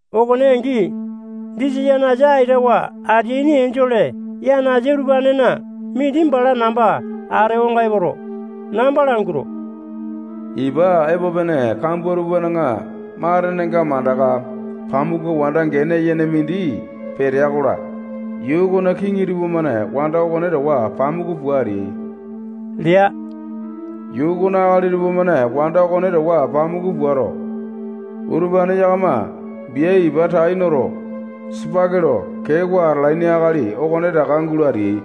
Okone angi, disa yanasa aitawa ateaini enjole yanasa utupanena mindi bala namba atewanga epoto, namba languato, ipa epo pene kambua tupana matenenga mandaka pamuku wanda gene yene mindi petea-kola, yuu okona kiŋi tupamane wanda okone towa pamuku pua ateai lea. Yuu okona akali tupamane wanda okone towa pamuku puato, utupane yakama bia ipa tai noto, sipaki lo keewa atalaini akali okonetaka gulo ateai.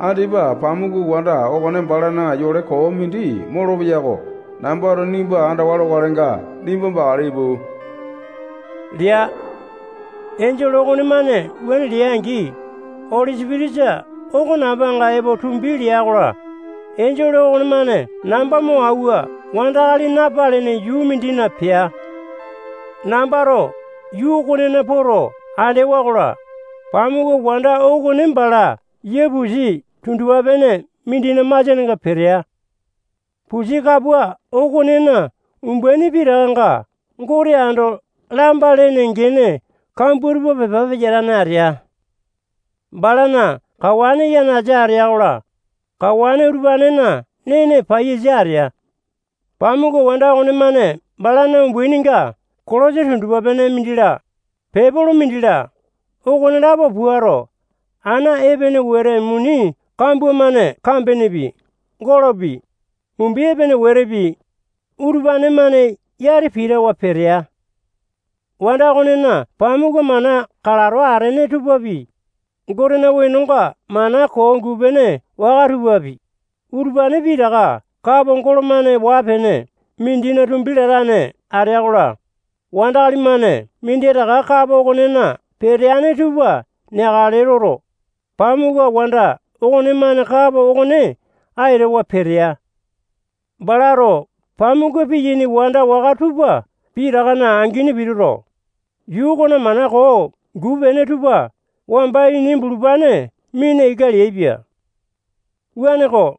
Andipa pamuku wanda okone balana yole koo mindi molopeya oko nambato nimba andawa lokalenga, nimba bakale ipu lea. Enjole okonemane wuane lea-angi, Oli Sipitisa oko nambanga epo tumbi lea-kola, enjole okonemane namba mo auwa wandakali napalene yuu mindina pea. Nambato yuu okonena poto andewa-kola, pamuku wanda okone bala yia pusi tundupa-pene mindina masianenga petea. Pusi kapua okonena umbaini pitakanga Gote ando lamba lene gene kambua tupa pepa peyatane atea. Balana kawane yanasa atea-kola, kawane utupanena nene paiyasa atea. Pamuku wanda okonemane balana umbaininga kolosa tundupa-pene mindi-la, pepolo mindi-la, okonelapo puato, ana epene wete muni kambua-mane kambenepi, golopi, mumbi epene wetepi, utupane-mane yati pitawa petea. Wanda okonena pamuku mana kalato atene tupapi, Gotena wenonga mana koo guu-pene waka tupapi, utupane pitaka kapo golo-mane waa-pene mindina tumbi latane atea-kola, wandakali-mane minditaka kapo okonena peteane tupa neakale loto, pamuku wanda okonemane kapo okone aitawa petea. Balato pamuku piyaini wanda waka tupa pitakana angini pituto, yuu okona mana koo guu-pene tupa wamba ini bulupane mina ika leaipia. Wuaneko,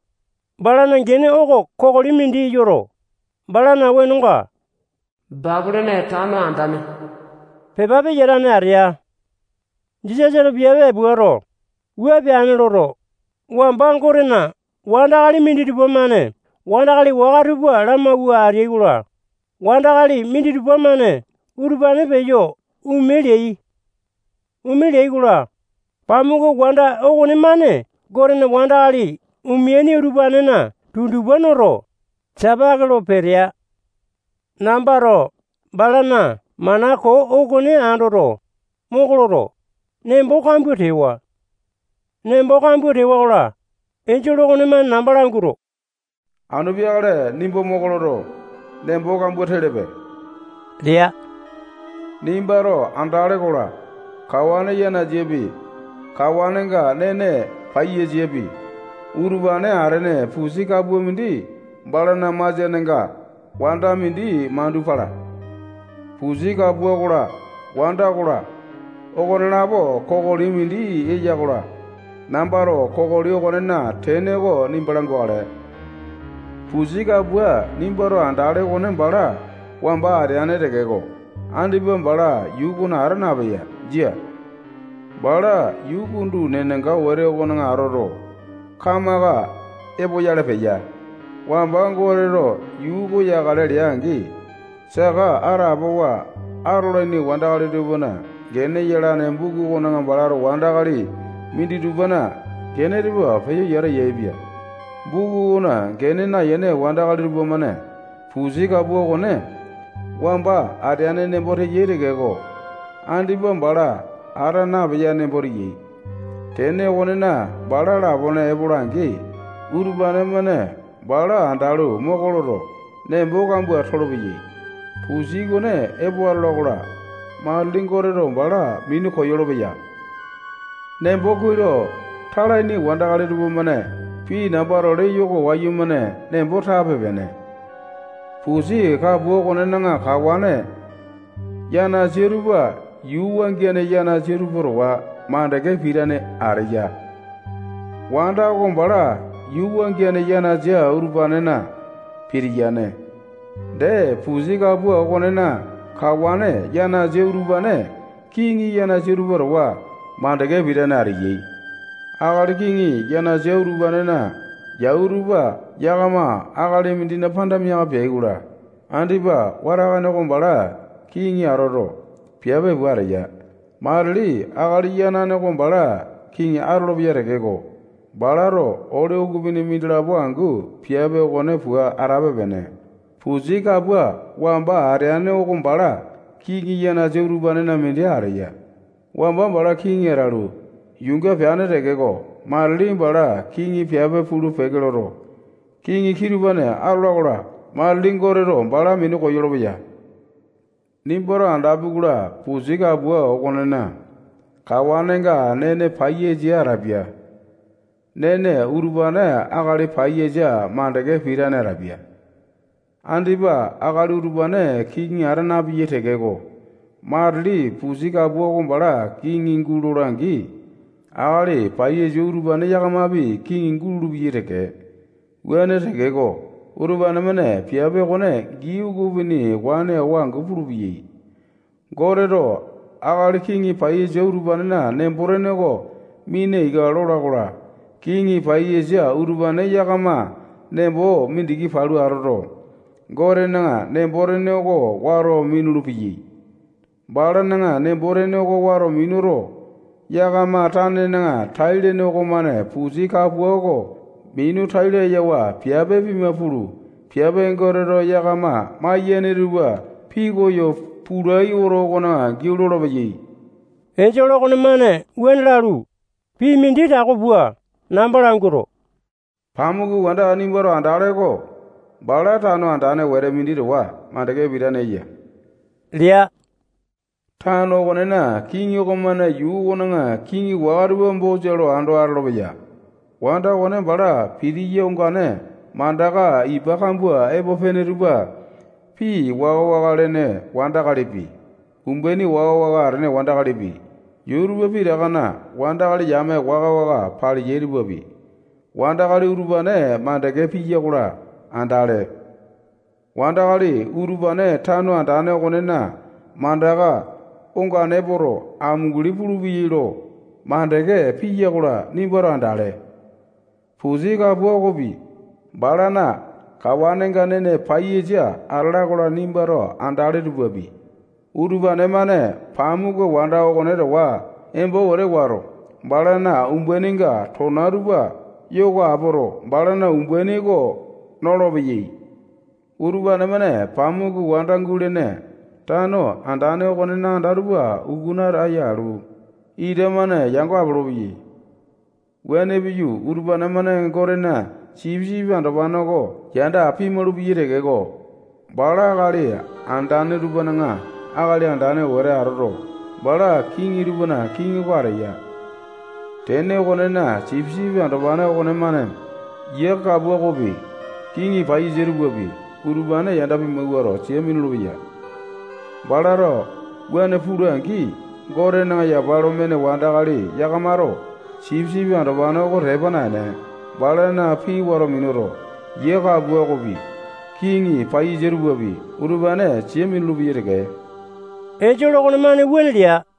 balana gene oko kokoli mindi yoto, balana wenonga Bapilone Tano Andane pepa peyatane atea. Jisasato piape puato, wua peane loto, wamba Gotena wandakali minditupa-mane wandakali waka tupa lamauwa ateai-kola, wandakali minditupa-mane utupane peyo ome leai. Ome leai-kola, pamuku wanda okonemane Gotena wandakali omeaini utupanena tundupa noto, sapake lo petea. Nambato balana mana koo okone andoto, moko loto, nembo kambua tewa. Nembo kambua tewa-kola, enjole okonemane namba languato, anu peakale nimba moko loto, nembo kambua telepe lea. Nimbato andale-kola, kawane yanasapi, kawanenga nene paiyasapi, utupane atene pusi kapua mindi balana masianenga wanda mindi mandu pala. Pusi kapua okola, wanda okola, okonelapo kokoli mindi eya-kola, nambato kokoli okonena tene oko nimba langukale. Pusi kapua nimbato andale okone bala wamba ateane tekeko, andipa bala yuu okona ata napeya. Jia. Bala yuu kundu nenanga wete okona atoto, kamaka epoyale peya. Wamba Goteto yuu oko yakale lea-angi, saka atapowa atolaini wandakali tupana gene yalane buku okona balato wandakali minditupana gene tupa peyo yata yaepia. Buku okona gene nayene wandakali tupamane pusi kapua okone wamba ateane nembo teyai tekeko, andipa bala ata napeya nembo teyai. Tene okonena, bala lapone epo atola-angi, utupane-mane bala andalu, moko loto, nembo kambua tolopeyai. Pusi okone epo atola-kola, matili Goteto bala minu koyolo-peya. Nembo kuai lo talaini wandakali tupamane pii nambato leyo oko wayumane nembo tape-pene. Pusi kapua okonena kawane yanasa tupa yuu wangiane yanasa tupa towa makande pitane ateya. Wanda oko bala yuu wangiane yanasa utupanena pitiyane. Dee, pusi kapua okonena kawane yanasa utupane kiŋi yanasa tupa towa makande pitane ateyai. Akali kiŋi yanasa utupanena yau tupa yakama akali mindina panda miaka peai-kola, andipa watakane oko bala kiŋi atoto, piape pua ateya. Matili akali yanane oko bala kiŋi atolopeya tekeko, balato ole ukupini mindilapo angu piape okone pua atape-pene. Pusi kapua wamba ateane oko bala kiŋi yanasa utupanena mindi ateya. Wamba bala kiŋi atalu, yuunga peane tekeko, matili bala kiŋi piape pulu-peke loto, kiŋi kitupane atola-kola, matili Goteto bala minu koyolo-peya. Nimbato andapi-kola, pusi kapua okonena kawanenga nene paiyasa atapia. Nene utupane akali paiyasa makande pitane atapia. Andipa akali utupane kiŋi ata napeyai tekeko, matili pusi kapua oko bala kiŋi gulola-angi, akali paiyasa utupane yakamapi kiŋi gulolo-peyai teke. Wuane tekeko, utupane-mane piape okone gii ukupini wane awa angu pulupeyai. Goteto akali kiŋi paiyasa utupanena nembo-tene oko mina ika lola-kola, kiŋi paiyasa utupane yakama nembo mindiki palu atoto, Gotena nembo-tene oko wato minulu-peyai. Balana nembo tene oko wato minuto, yakama tanena tai-lene okomane pusi kapua oko minu tai layawa piape pima pulu, piape Goteto yakama maiyane tupa pikoyo pulai oto okona giau lolopeyai. Enjole okonemane wuane lalu, pii mindi tako pua namba languato, pamuku wanda nimbato andale oko bala tano andane wete mindi towa makande pitane eya lea. Tano okonena kiŋi okomane yuu okona kiŋi waka tupa bosa lo ando atolopeya. Wanda okone bala pitiya ongane mandaka ipa kambua epo pene tupa pii waka-waka lene wandakalipi, umbaini waka-waka atene wandakalipi, yuu tupa pitakana wandakali yame waka-waka paleyai tupapi, wandakali utupane makande piya-kola, andale. Wandakali utupane tano andane okonena mandaka ongane epoto, amunguli pulupeyai lo makande piya-kola, nimbato andale. Pusi kapua okopi, balana kawanenga nene paiyasa atala-kola, nimbato andale tupapi, utupane-mane pamuku wanda okone towa embo wete wato, balana umbaininga tona tupa yoko apoto, balana umbaini oko nolopeyai. Utupane-mane pamuku wanda gulene tano andane okonena anda tupa ukuna ataya alu, ita-mane yango apolopeyai. Wuane piyu, utupane-mane Gotena sipisipi andopane oko yanda pimalu-peyai tekeko, bala akali andane tupana akali andane wete atoto, bala kiŋi tupana kiŋi oko ateya. Tene okonena, Sipisipi Andopane okonemane yia kapua okopi, kiŋi paiyasa tupapi, utupane yanda pimawuato, sia minulu-peya. Balato wuane pula-angi, Gotena yapa lo mene wandakali yakamato Sipisipi Andopane oko tepa naene, balana pii wato minuto, yia kapua okopi, kiŋi paiyasa tupapi, utupane sia minulu-peyai teke. Enjole okonemane wuane lea.